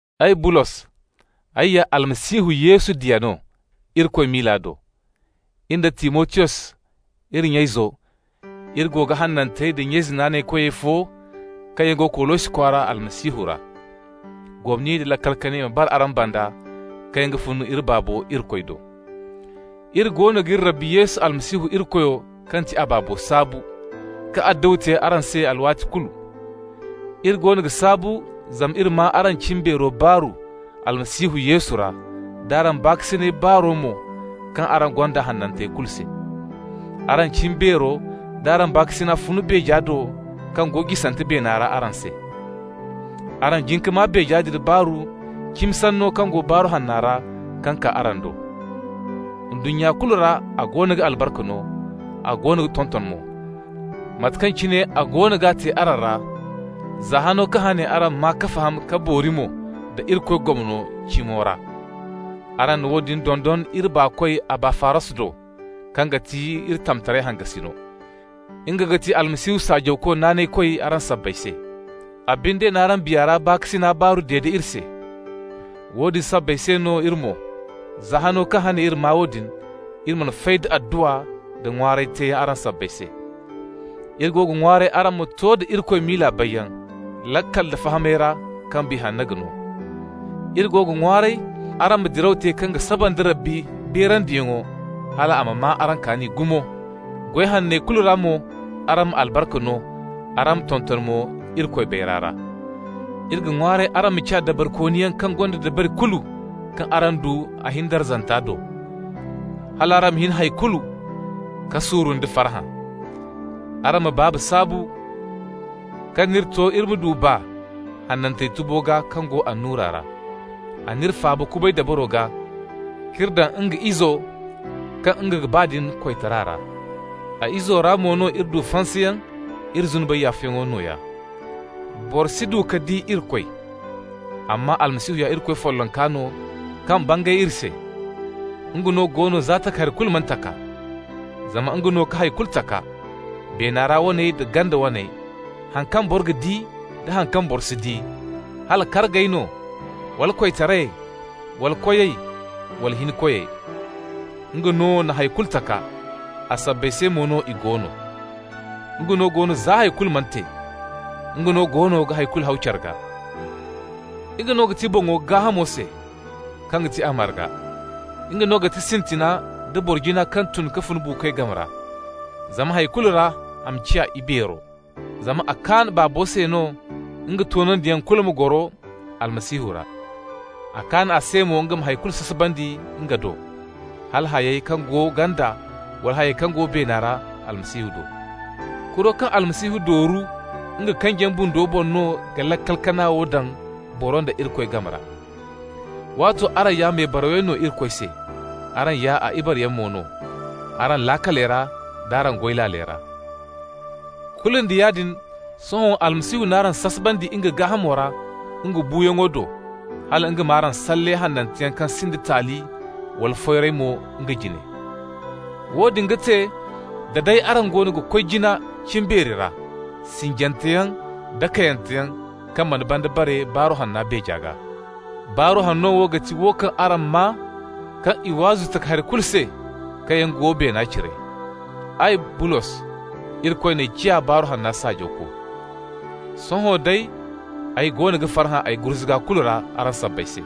Ay, Bulos, ay ya Almasihu Yesu diya no Irikoy miila do. In da Timotiyos, iri nya-izo, iri go ga hanantey da nya-ize naanaykoyey fo kaŋ yaŋ go Kolosi kwaara Almasihu ra. Gomni nda laakal kanay ma bara araŋ banda kaŋ yaŋ ga fun iri Baabo Irikoy do. Iri goono g'iri Rabbi Yesu Almasihu Irikoyo kaŋ ti a Baabo saabu, ka adduwa te araŋ se alwaati kulu. Iri goono ga saabu zama iri maa araŋ cimbeero baaru Almasihu Yesu ra, d'araŋ baakasinay baaro mo kaŋ araŋ gonda hanantey kulu se. Araŋ cimbeero d'araŋ baakasina fun beeja do kaŋ go jisante beena ra araŋ se. Araŋ jin ka maa beeja din baaru cimi sanno kaŋ go Baaru Hanna ra kaŋ kaa araŋ do. Ndunnya kulu ra a goono ga albarka no, a goono ga tonton mo, mate kaŋ cine a goono ga te araŋ ra, za hano kaŋ hane araŋ maa ka faham ka boori mo da Irikoy gomno cimo ra. Araŋ na woodin dondon iri baakoy Abafaras do, kaŋ ga ti iri tamtaray hangasino. Nga ga ti Almasihu saajawko naanaykoy araŋ sabbay se. A binde n'araŋ Biya ra baakasina baaru dede iri se. Woodin sabbay se no iri mo, za hano kaŋ hane iri maa woodin, iri mana fay da adduwa nda ŋwaaray teeyaŋ araŋ sabbay se. Iri go ga ŋwaaray araŋ ma to da Irikoy miila bayyaŋ, laakal da fahamay ra kaŋ Biya Hanno ga no. Iri go ga ŋwaaray araŋ ma diraw te kaŋ ga saba nda Rabbi beerandiyaŋo hal a ma maa araŋ kaani gumo, goy hanney kulu ra mo araŋ ma albarka no, araŋ ma tonton mo Irikoy bayray ra. Iri ga ŋwaaray araŋ ma ciya dabarikooniyaŋ kaŋ gonda dabari kulu kaŋ araŋ du a hin darzanta do, hal araŋ ma hin hay kulu ka suuru nda farhã. Araŋ ma Baaba saabu kaŋ n'iri to iri ma du baa hanantey tubo gaa kaŋ go annura ra. A n'iri faaba kubay dabaro gaa k'iri daŋ nga Izo kaŋ nga ga ba din koytara ra. A Izo ra mo no iri du fansayaŋ, iri zunubey yaafayaŋo nooya. Boro si du ka di Irikoy, amma Almasihu ya Irikoy follonka no kaŋ bangay iri se. Nga no go no za takahari kulu mana taka. Zama nga no ka hay kulu taka, beena ra waney da ganda waney, haŋ kaŋ boro ga di da haŋ kaŋ boro si di, hala kargey no wala koytarayey wala koyey wala hinkoyey. Nga no na hay kulu taka, a sabbay se mo no i go no. Nga no go no za hay kulu mana te. Nga no goono ga hay kulu haw care gaa. Nga no ga ti boŋo gaahamo se, kaŋ ga ti a marga. Nga no ga ti sintina nda boro jina kaŋ tun ka fun buukoy game ra, zama hay kulu ra a ma ciya ibeero. Zama a kaan Baabo se no nga toonandiyaŋ kulu ma goro Almasihu ra. A kaan a se mo nga ma hay kulu sasabandi nga do, hala hayey kaŋ go ganda wala hayey kaŋ go beena ra, Almasihu do. Kuro kaŋ Almasihu dooru nga kanjiyaŋ bundo boŋ no ka laakal kana wo daŋ boro nda Irikoy game ra. Waato araŋ ya mebarawyaŋ no Irikoy se, araŋ ya a ibareyaŋ mo no araŋ laakaley d'araŋ goy laaley ra. Kulu nda yaadin sohõ Almasihu n'araŋ sasabandi nga gaahamo ra nga buuyaŋo do, hal nga m'araŋ salle hananteyaŋ kaŋ sinda taali nda foyray mo nga jine. Woodin ga te da day araŋ goono ga koy jina cimbeeri ra, sinjanteyaŋ da kayyanteyaŋ kaŋ mana banda bare Baaru Hanna beeja gaa. Baaru Hanno wo ga ti wo kaŋ araŋ maa, kaŋ i waazu takahari kulu se kaŋ yaŋ go beena cire. Ay, Bulos, Irikoy n'ay ciya Baaru Hanna saajawko. Sohõ day, ay goono ga farhã ay gurzuga kulu ra araŋ sabbay se.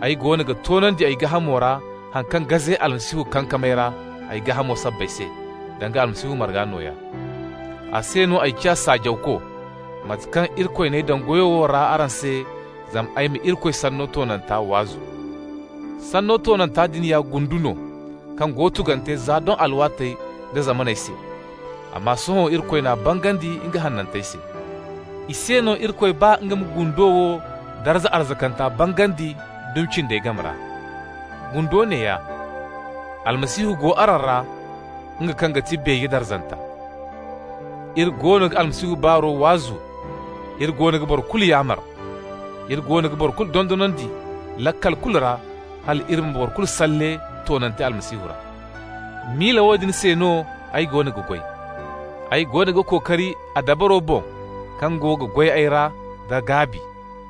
Ay goono ga toonandi ay gaahamo ra haŋ kaŋ gaze Almasihu kankamey ra a gaahamo sabbay se, danga Almasihu marga nooya. A se no ay ciya saajawko, mate kaŋ Irikoy n'ay daŋ goyo wo ra araŋ se, zama ay ma Irikoy sanno toonanta waazu. Sanno toonanta din ya gundu no kaŋ go tugante za doŋ alwaatey da zamaney se, amma sohõ Irikoy n'a bangandi nga hanantey se. I se no Irikoy ba nga ma gundo wo darza arzakanta bangandi dumi cindey game ra. Gundo neeya: Almasihu go araŋ ra, nga kaŋ ga ti beeje darzanta. Iri goono ga Almasihu baaro waazu, iri goono ga boro kulu yaamar. Iri goono ga boro kulu dondonandi laakal kulu ra, hal iri ma boro kulu salle toonante Almasihu ra. Miila woodin se no ay goono ga goy. Ay goono ga kookari a dabaro boŋ kaŋ go ga goy ay ra da gaabi.